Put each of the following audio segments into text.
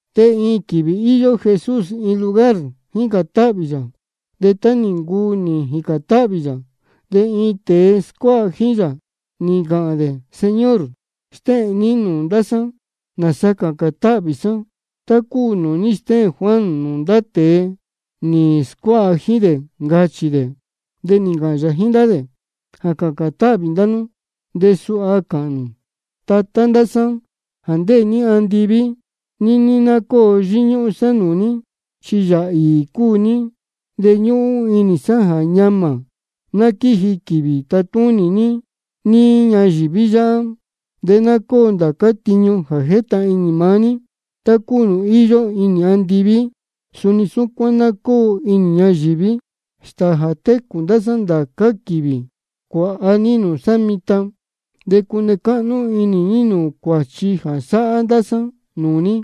De iin quīvī íyó Jesús iin lugar, jícān táhvī yā. De tá nī ncuu nī jīcān táhvī yā, de iin tēe scuáha jíín yā, nī ncāhān dē: Señor, stéhēn ní nūū ndá sá nāsa cācān táhvī sá, tá cúu nūū ní stéhēn Juan nūū ndá tēe nī scuáha jíín dē, ncachī dē. De nī ncāhān yā jíín ndá dē: Jā cācān táhvī ndá nú, de suha cāhān nū: Tatá ndá sá jā ndéē ní andiví, níní ná cóo yíñúhún sá nūū ní, chi Yāā īī cúu ní. De ñúhún inī sá jā ñamā ná quíji quīvī tatúnī ní níí ñayīví yáhá. De ná cóo ndācá tiñu jā jétahān inī maá ní, tá cúu nūū íyó inī andiví, suni súcuán ná cóo inī ñayīví. Stāā jā técū ndá sá ndācá quīvī, cuāha ní nūū sá mitan. De cune cáhnú inī ní nūū cuāchi jā sáhá ndá sá nūū ní,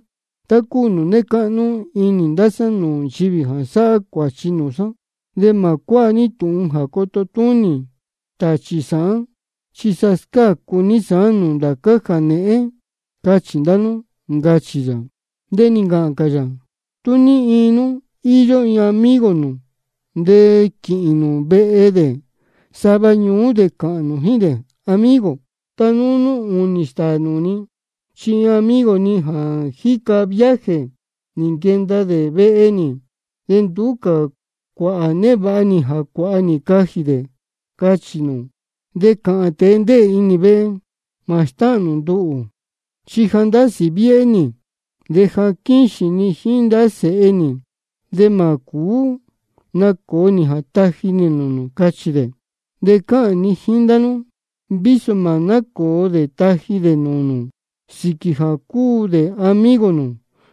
tá cúu nūū née cáhnú inī ndá sá nūū nchivī jā sáhá cuāchi nūū sá. De mā cuáha ní tūhun jā coto túnī tāchī sāán, chi sa scácu ní sāán nūū ndācá jānēhén. Cachī ndá nú, ncachī yā. De nī ncāhān cā yā: Tú ní iin nú íyó iin amigo nū, de quīhīn nū vehe dē sava ñuú de cāhān nū jíín dē: Amigo, tanúú nú ūnī stāā nūū ni. Chi iin amigo ni jā jíca viaje, nī nquenda dē vehe nī, de nduú nā cuá névāha nī jā cuāha nī cajī dē, cachī nū. De cāhān tēe ndéē inī vehe: Mā stáhān nū nduhū, chi ja ndásī viéhé nī, de ja quíxīn ni jíín ndá sēhe nī, de mā cūú nacōo nī jā taji nī nūū nū, cachī dē. De cáhān ni jíín ndá nú, vísō mā nácōo dē taji dē nūū nū sīquī jā cúu dē amigo nū,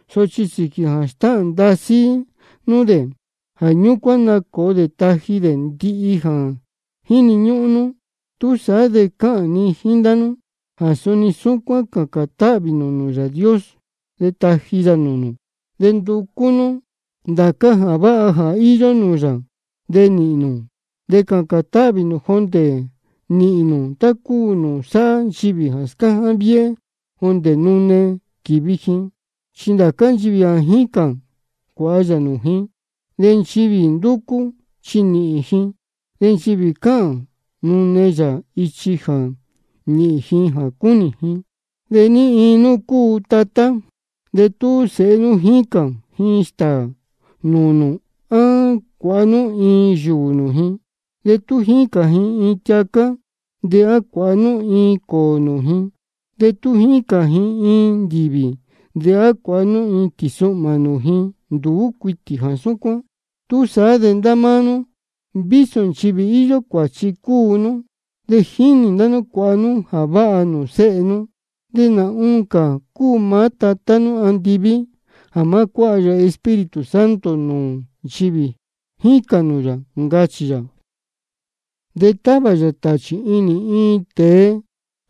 sochi sīquī jā stáhān ndasí nú dē, jā ñúcuán nacōo dē taji dē ndihi jā jíni ñúhún nú. Túsaá de cáhān ni jíín ndá nú jā suni súcuán cācān táhvī nū nūū Yāā Dios, de taji yā nūū nū. De nducú nú ndācá jā váha jā íyó nūū yā, de nīhīn nū. De cācān táhvī nū jondē nīhīn nū, tá cúu nūū sáhá nchivī jā scáján viéhé jondē nune quīvi ji. Chi ndācá nchivī jā jícān, cuāha yā nūū ji. De nchivī ndúcú, chi nīhīn ji. De nchivī cáhān, nune yā ichi jā nīhīn ji jā cúnī ji. ¿De ní iin nú cúu tatá, de tú sēhe nú jícān ji stāā nūū nū, de á cuāha nú iin yūū nūū ji? De tú jícān ji iin tiacá, ¿de á cuāha nú iin cōō nūū ji? De tú jícān ji iin ndīvī, ¿de á cuāha nú iin tīsuhmā nūū ji? Nduú cuitī jā súcuán. Túsaá de ndá máá nú vísō nchivī íyó cuāchi cúu nú, de jínī ndá nú cuāha nú jā váha nūū sēhe nú. De nā oncā cúu maá Tatá nú andiví jā má cuáha yā Espíritu Santo nūū nchivī jícān nūū yā, ncachī yā. De távā yā iin tāchī inī iin tēe,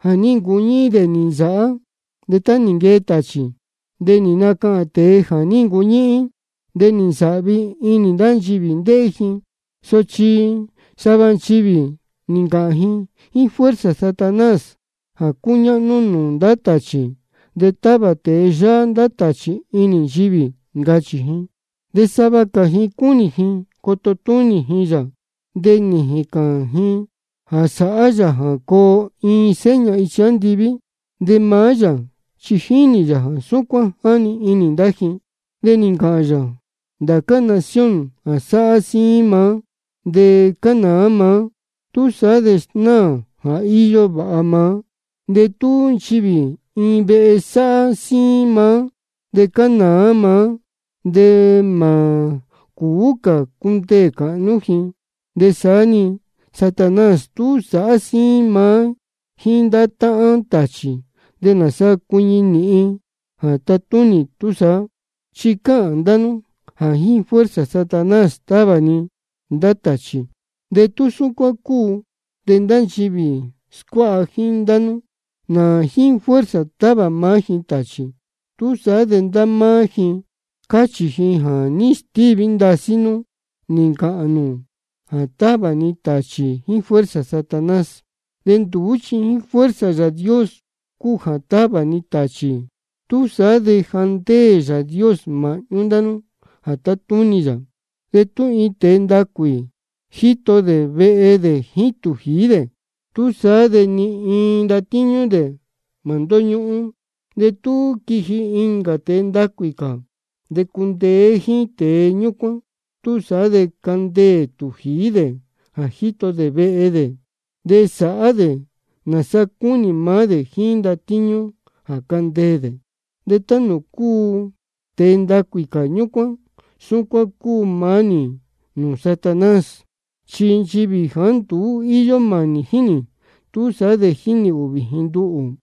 jā ní ncuñíhín dē nī nsāhá. De tá nī nquee tāchī, de nī nacahān tēe jā ní ncuñíhín. De nī nsāhvi inī ndá nchivī ndéhé ji. Sochi sava nchivī nī ncāhān ji: Jíín fuerza Satanás jā cúñáhnú nūū ndá tāchī, de távā tēe yáhá ndá tāchī inī nchivī, ncachī ji. De sava cā ji cúnī ji coto túnī ji yā, de nī jīcān ji jā sāhá yā jā coo iin seña ichi andiví. De maá yā chi jínī yā jā súcuán jáni inī ndá ji, de nī ncāhān yā: Ndācá nación jā sáhá síín maá de cánāá maá, túsaá de snáā jā íyó vāha maá. De tú nchivī iin vehe sáhá síín maá de cánāá maá, de mā cūú cā cundeē cāhnú ji. De saá-ni Satanás, tú sáhá síín maá jíín ndá táhán tāchī, ¿de nāsa cuiñi nīhin jā tatúnī túsaá? Chi cáhān ndá nú jā jíín fuerza Satanás távā ni ndá tāchī. De tú súcuán cúu de ndá nchivī scuáha jíín ndá nú, ¿nā jīín fuerza távā maá ji tāchī? Túsaá de ndá máá ji cachī ji jā ní stíví ndasí nú nī ncāhān nū jā távā ni tāchī jíín fuerza Satanás. De nduú chi jíín fuerza Yāā Dios cúu jā távā ni tāchī. Túsaá de ja ndéē Yāā Dios māhñú ndá nú jā tátúnī yā. De tú iin tēe ndacuī jíto dē vehe dē jíín tūjīí dē, túsaá de ni iin ndatíñú dē mā ndóñúhún. De tú quiji incā tēe ndacuī cā, de cundeé jíín tēe ñúcuán, túsaá de candeē tūjīí dē jā jíto dē vehe dē, de sāhá dē nāsa cúnī maá dē jíín ndatíñú jā candeē dē. De tá nūū cúu tēe ndacuī cā ñúcuán, súcuán cúu maá nī nūū Satanás. De nchivī jāá nduú íyó mānī jíín nī, túsaá de jínī ūhvī ji nduhū.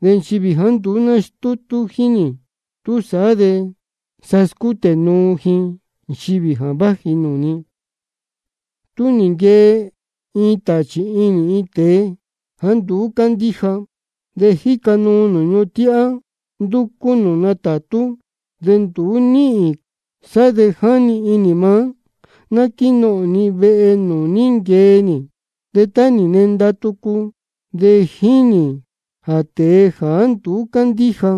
De nchivī jāá nduú nástútú jíín nī, túsaá de sa scútē nuu ji nchivī jā váji nūū ni. Tú nī nquee iin tāchī inī iin tēe jāá nduú cándíja, de jíca nuu nūū ñuhun tíhá, ndúcú nūū natātú, de nduú níhīn, sá de jáni inī maá: Ná quínohōn ni vehe nūū ní nquee nī. De tá nī nenda tucu, de jínī jā tēe jāá nduú cándíja,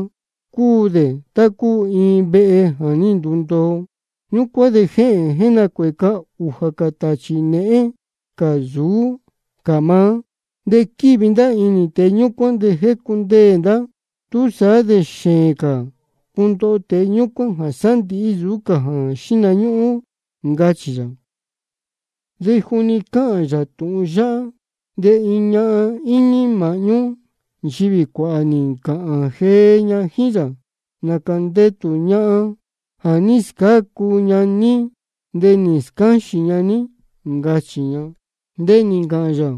cúu dē tá cúu iin vehe jā ní ndundoo. Ñúcuán de jéhēn jénacuēca ūjā cā tāchī nēhén cā nsūú cā maá. De quívi ndá inī tēe ñúcuán de jécundeē ndá. Túsaá de xēēn cā cundoho tēe ñúcuán jā sándīhí nsūú cā jā xíhna ñúhún, ncachī yā. De juni cáhān yā tūhun yáhá, de iin ñahan íñí māhñú nchivī cuāhā, nī ncāhān jee ña jíín yā: Nācā ndetū ñahan jā ní scácu ña ní de nī scáxīn ña ní, ncachī ña. De nī ncāhān yā: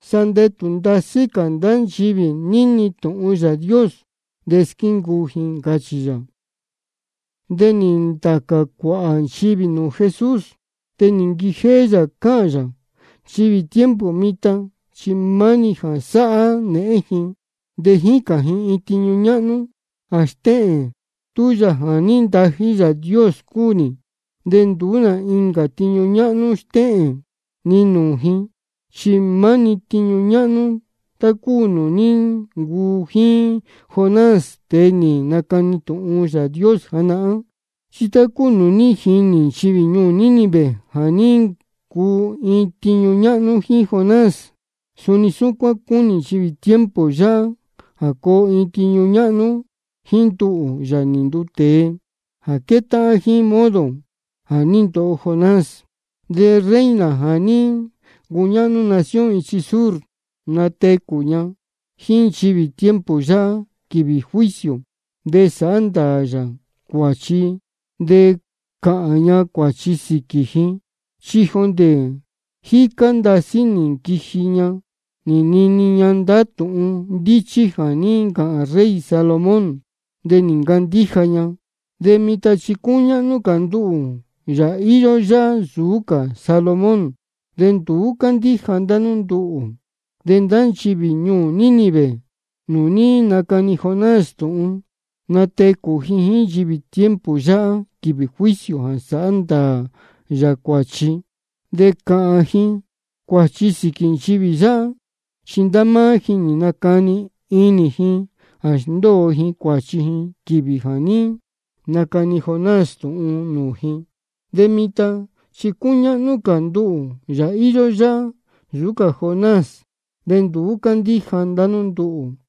Sa ndetū ndasí cā ndá nchivī níni tūhun Yāā Dios de squíncuu ji, ncachī yā. De nī ntācā cuāhā cā nchivī nūū Jesús, de nī nquijéhé yā cáhān yā: Nchivī tiempo mitan chi maá-ni jā sáhá nēhén ji. De jícān ji iin tiñu ñáhnú jā stéhēn tú Yāā jā ní ntají Yāā Dios cúu nī. De nduú nā incā tiñu ñáhnú stéhēn ni nūū ji, chi maá-ni tiñu ñáhnú tá cúu nūū ní ncuu jíín Jonás, tēe nī nacani tūhun Yāā Dios janahán. Chi tá cúu nūū ní jinī nchivī ñuū Nínive jā ní ncuu iin tiñu ñáhnú jíín Jonás, suni súcuán cunī nchivī tiempo yáhá jā coo iin tiñu ñáhnú jíín nduhū, Yāā nī nduu tēe, jā quétáhán jíín modo jā ní ndoho Jonás. De reina jā ní ncuñáhnú nación ichi sur, natecū ña jíín nchivī tiempo yáhá, quīvī juicio jā sāhá ndāā yā cuāchi, de cāhān ña cuāchi sīquī ji. Chi jondē jícá ndasí nī nquiji ña nī nini ña ndá tūhun ndíchí jā ní ncāhān rey Salomón, de nī ncandíja ña. De mitan chi cúñáhnú cā nduhū, Yāā íyó yáhá, nsūú cā Salomón, de nduú cándíja ndá nú nduhū. De ndá nchivī ñuū Nínive nūū ní nacani Jonás tūhun, natecū ji jíín nchivī tiempo yáhá, quīvī juicio jā sāhá ndāā yā cuāchi, de cāhān ji cuāchi sīquī nchivī yáhá. Chi ndá máá ji nī nacani inī ji nī sndóo ji cuāchi ji quīvī jā ní nacani Jonás tūhun nūū ji. De mitan chi cúñáhnú cā nduhū, Yāā íyó yáhá, nsūú cā Jonás, de nduú cándíja ndá nú nduhū.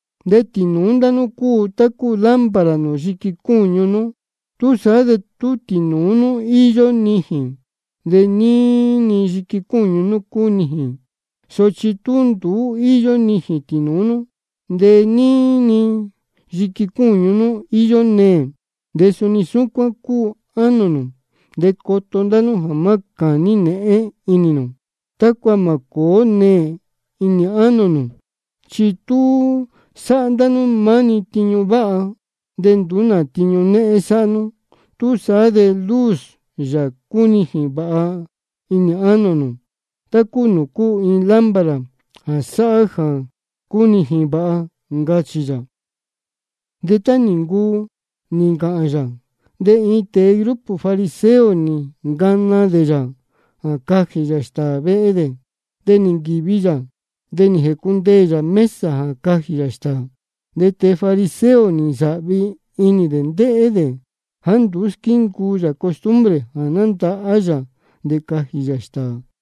De tīnūú ndá nú cúu tá cúu lámpara nūū yiqui cúñu nú. Túsaá de tú tīnūú nú íyó nijīn, de níí-ni yiqui cúñu nú cunijīn. Sochi tú nduú íyó nijīn tīnūú nú, de níí-ni yiqui cúñu nú íyó neē. De suni súcuán cúu ánō nū, de coto ndá nú jā má cāní nēhén inī nū, tácua mā cōó neē inī ánō nū. Chi tú sáhá ndá nú maá-ni tiñu váha, de nduú nā tiñu néhén sáhá nú, túsaá de luz yā cunijīn vāha inī ánō nū, tá nūū cúu iin lámpara jā sáhá jā cúnijīn vāha, ncachī yā. De tá nī ncuu nī ncāhān yā, de iin tēe grupo fariseo nī ncana dē yā jā cajī yā stāā vehe dē. De nī nquīvi yā, de nī jēcundeē yā mesa jā cajī yā stāā. De tēe fariseo nī nsāhvi inī dē ndéhé dē jāá nduú squíncuu yā costumbre jā nandahá yā de cajī yā stāā.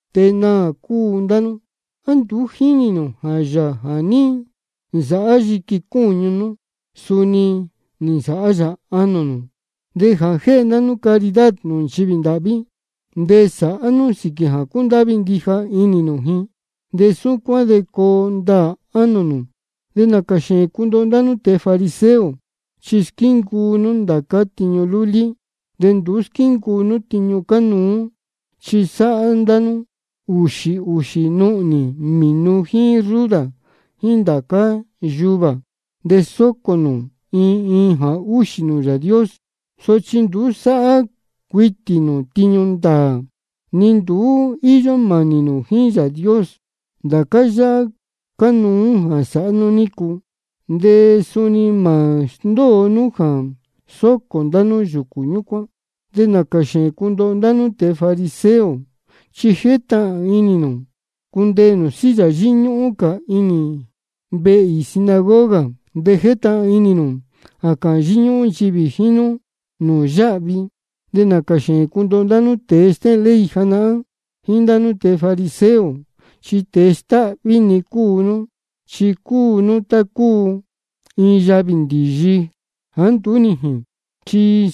Tēe naā cúu ndá nú. ¿A nduú jínī nū jā Yāā jā ní nsāhá yiqui cúñu nú, suni nī nsāhá yā ánō nū? De jā jéhe ndá nú caridad nūū nchivī ndāhví, de sāhá nú sīquī jā cúndáhví ndija inī nū ji. De súcuán de coo ndaā ánō nū. De nācā xēēn cundoho ndá nú tēe fariseo, chi squíncuu nú ndācá tiñu lúlí, de nduú squíncuu nú tiñu cánuú. Chi sáhá ndá nú ūxī ūxī nuhnī mīnu jíín ruda jíín ndācá yuvā, de sócō nū iin iin jā úxī nūū Yāā Dios. Sochi nduú sáhá cuitī nū tiñu ndāā, ni nduú íyó mānī nū jíín Yāā Dios. Ndācá yáhá cánuú jā sāhá nú nícu, de suni mā sndóo nú jā sōcō nū ndá yūcū ñúcuán. De nācā xēēn cundoho ndá nú tēe fariseo, chi jétahān inī nū cundeē nū nūū silla yíñúhún cā inī vehe īī sinagoga, de jétahān inī nū jā cáhān yíñúhún nchivī jíín nú nūū yáhvi. De nācā xēēn cundoho ndá nú tēe stéhēn ley janahán, jíín ndá nú tēe fariseo, chi tēe stáhví-ni cúu nú. Chi cúu nú tá cúu iin yavī ndīyi jāá nduú nijīn, chi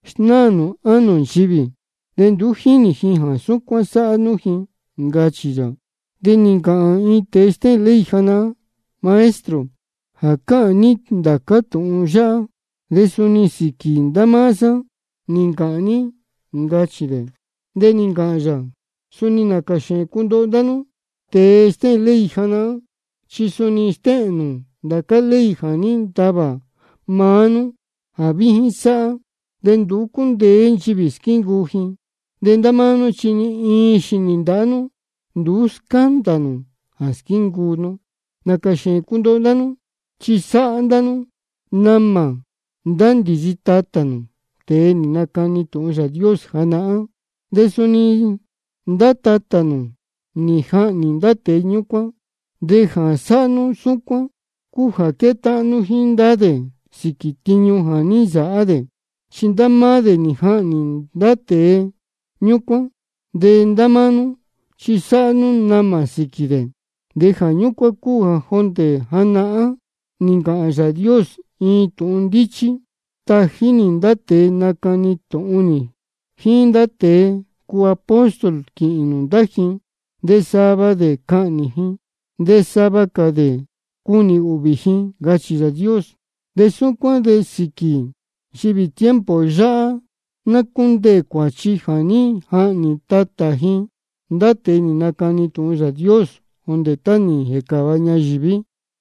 snáā nū ánō nchivī, de nduú jínī ji jā súcuán sáhá nú ji, ncachī yā. De nī ncāhān iin tēe stéhēn ley janahán: Maestro, jā cáhān ní ndācá tūhun yáhá, de suni sīquī ndá máá sá nī ncāhān ní, ncachī dē. De nī ncāhān yā: Suni nācā xēēn cundoho ndá nú tēe stéhēn ley janahán. Chi suni stéhēn nū ndācá ley jā ní ntavā maá nú jā víjín sáhá, de nduú cúndeé nchivī squíncuu ji. De ndá máá nú chi ni iin xīnī ndāhá nú nduú scándā nū jā squíncuu nú. Nācā xēēn cundoho ndá nú. Chi sáhá ndá nú namā ndá ndīyi tatā nū, tēe nī nacani tūhun Yāā Dios janahán. De suni ndá tatā nū nī jahnī ndá tēe ñúcuán. De jā sáhá nú súcuán cúu jā quétáhán nú jíín ndá dē sīquī tiñu jā ní nsāhá dē. Chi ndá máá dē nī jahnī ndá tēe ñúcuán, de ndá máá nú chi sáhá nú namā sīquī dē. Jā ñúcuán cúu jā jondē janahán nī ncāhān Yāā Dios iin tūhun ndíchí: Tají nī ndá tēe nacani tūhun nī jíín ndá tēe cúu apóstol quīhīn dē nūū ndá ji. De sava dē cahnī ji, de sava cā dē cunī ūhvī ji, ncachī Yāā Dios. De súcuán de sīquī nchivī tiempo yáhá ná cúndeē cuāchi jā ní jahnī tatā ji ndá tēe nī nacani tūhun Yāā Dios, jondē tá nī jēcāva ñayīví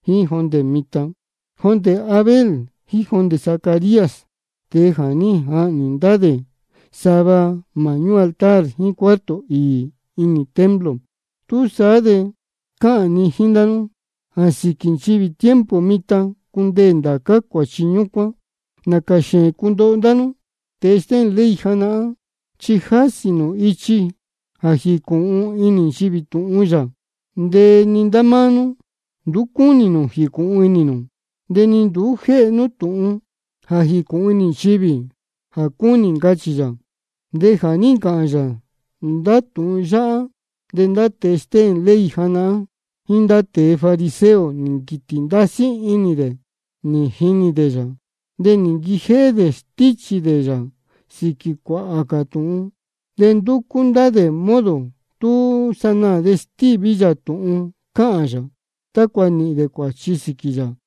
jíín jondē mitan, jondē Abel jíín jondē Zacarías, tēe jā ní jahnī ndá dē sava māhñú altar jíín cuarto īī inī templo. Túsaá de cáhān ni jíín ndá nú jā sīquī nchivī tiempo mitan cundeē ndācá cuāchi ñúcuán. Nācā xēēn cundoho ndá nú, tēe stéhēn ley janahán, chi jásī nū ichi jā jīcūhun inī nchivī tūhun yā. De ni ndá máá nú nduú cúnī nū jīcūhun inī nū, de ni nduú jéhe nú tūhun jā jīcūhun inī nchivī jā cúnī, ncachī yā. De jā ní ncāhān yā ndá tūhun yáhá, de ndá tēe stéhēn ley janahán jíín ndá tēe fariseo, nī nquītī ndasí inī dē nī jinī dē yā. De nī nquijéhé dē stíchī dē yā sīquī cuāhā cā tūhun. De ndúcú ndá dē modo tú sanaā de stíví yā tūhun cāhān yā, tácua nīhīn dē cuāchi sīquī yā.